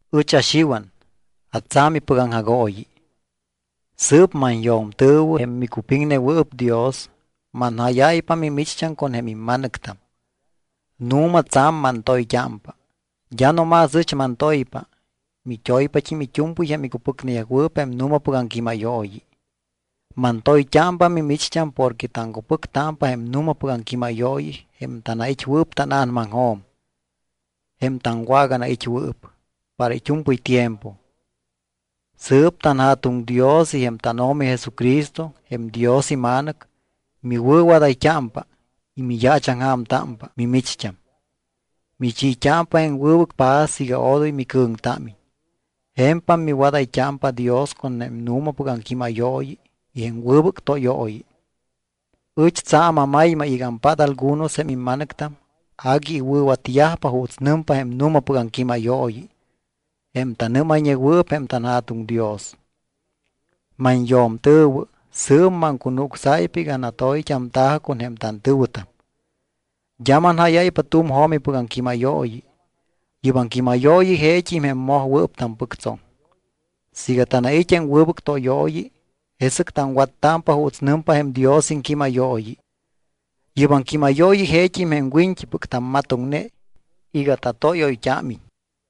Ɨch aXiwan, atsa̱mipɨc aŋjagooyi. Sɨɨp manyo̱mtɨ̱wɨ, jém micupiŋnewɨɨp Dios, manjáyáypa mimicht́am con jém imma̱nɨctam. Nu̱ma tsa̱m mantoyt́ámpa. D́a no más ɨch mantoypa, mit́oyt́ámpat́im it́u̱mpɨy jém icupɨcneyajwɨɨp jém nu̱mapɨc aŋquímayooyi. Mantoyt́ámpa mimicht́am porque taŋcupɨctámpa jém nu̱mapɨc aŋquímayooyi jém tanait́wɨɨp tána̱namaŋjo̱m, jém taŋwaganait́wɨɨp para it́u̱mpɨy tiempo. Sɨɨp tanJa̱tuŋ Dios y jém tánO̱mi Jesucristo, jém Dios iMa̱nɨc, miwɨ̱wadayt́ámpa y miyaachaŋja̱mtámpa mimicht́am. Michiit́ámpa jém wɨbɨc paz iga odoy micɨ̱ŋtámiñ. Je̱mpam miwadayt́ámpa Dios con jém nu̱mapɨc aŋquímayooyi y jém wɨbɨc tóyooyi. Ɨch tsa̱m amaymay iga ampát algunos jém imma̱nɨctam agui iwɨ̱watyajpa juuts nɨmpa jém nu̱mapɨc aŋquímayooyi, jém tanɨ́mayñewɨɨp jém tanJa̱tuŋ Dios. Manyo̱mtɨ̱wɨ, sɨɨp maŋcunucsáypa iga natoyt́amta̱jɨ con jém tantɨ̱wɨtam. D́a manjáyáypa tu̱m jo̱mipɨc aŋquímayooyi. Yɨ́p aŋquímayooyi jeet́im jém mojwɨɨp tampɨctsoŋ. Siiga tanait́ jém wɨbɨc tóyooyi, jesɨc taŋwattámpa juuts nɨmpa jém Dios iŋquímayooyi. Yɨ́p aŋquímayooyi jeet́im jém wiñt́ipɨc tammatoŋne iga tatóyoyt́ámiñ.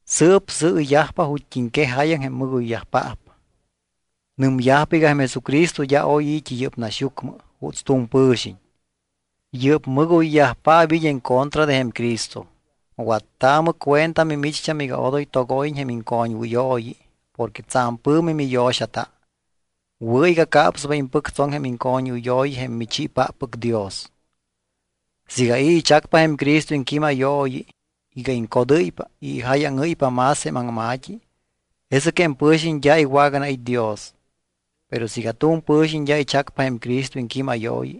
Sɨɨp sɨɨyajpa ju̱t́iŋquej jáyaŋ jém mɨgoyyajpaap. Nɨmyajpa iga jém Jesucristo d́a oy i̱t́i yɨ́p naxyucmɨ juuts tu̱m pɨ̱xiñ. Yɨ́p mɨgoyyajpaap it́ en contra de jém Cristo. Wattaamɨ cuenta mimicht́am iga odoy togóyiñ jém iŋcoñwɨyooyi porque tsa̱m pɨ̱mi miyo̱xata. Wɨ̱ iga capspa impɨctsoŋ jém iŋcoñwɨyooyi jém michiipáppɨc Dios. Siiga i̱ ichacpa jém Cristo iŋquímayooyi iga iŋcodɨ́ypa y ijáyaŋɨ́ypa más jém aŋma̱t́i, jesɨc jém pɨ̱xiñ d́a iwaganait́ Dios. Pero siiga tu̱m pɨ̱xiñ d́a ichacpa jém Cristo iŋquímayooyi,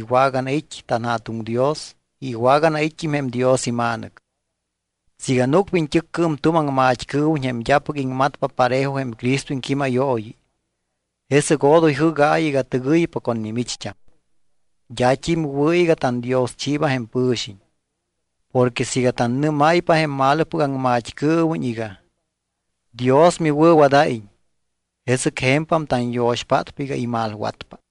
iwaganait́ tanJa̱tuŋ Dios y iwaganait́t́im jém Dios iMa̱nɨc. Siiga núcpa iñt́ɨccɨɨm tu̱m aŋmat́cɨɨwiñ jém d́apɨc iŋmatpa parejo jém Cristo iŋquímayooyi, jesɨc odoy jɨ́gaayɨ iga tɨgɨypa con mimicht́am. D́at́im wɨ̱ iga tandioschiiba jém pɨ̱xiñ. Porque siiga tannɨ́máypa jém malopɨc aŋmat́cɨɨwiñ iga: Dios miwɨ̱wadáyiñ, jesɨc je̱mpam tanyo̱xpátpa iga imalwatpa.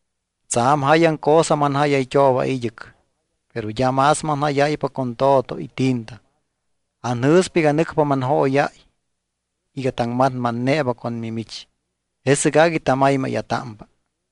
Tsa̱m jáyaŋ cosa manjáyayt́ooba id́ɨc, pero d́a más manjáyáypa con to̱to y tinta. Anjɨ̱spa iga nɨcpa manjóyáy iga taŋmatmatneeba con mimich, jesɨc agui tamaymáya̱támpa.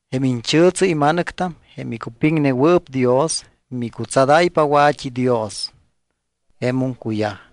Jém iñchɨ̱tsɨ ima̱nɨctam, jém icupiŋnewɨɨp Dios, micutsadáypa wa̱t́idios. Jemum cuyaj.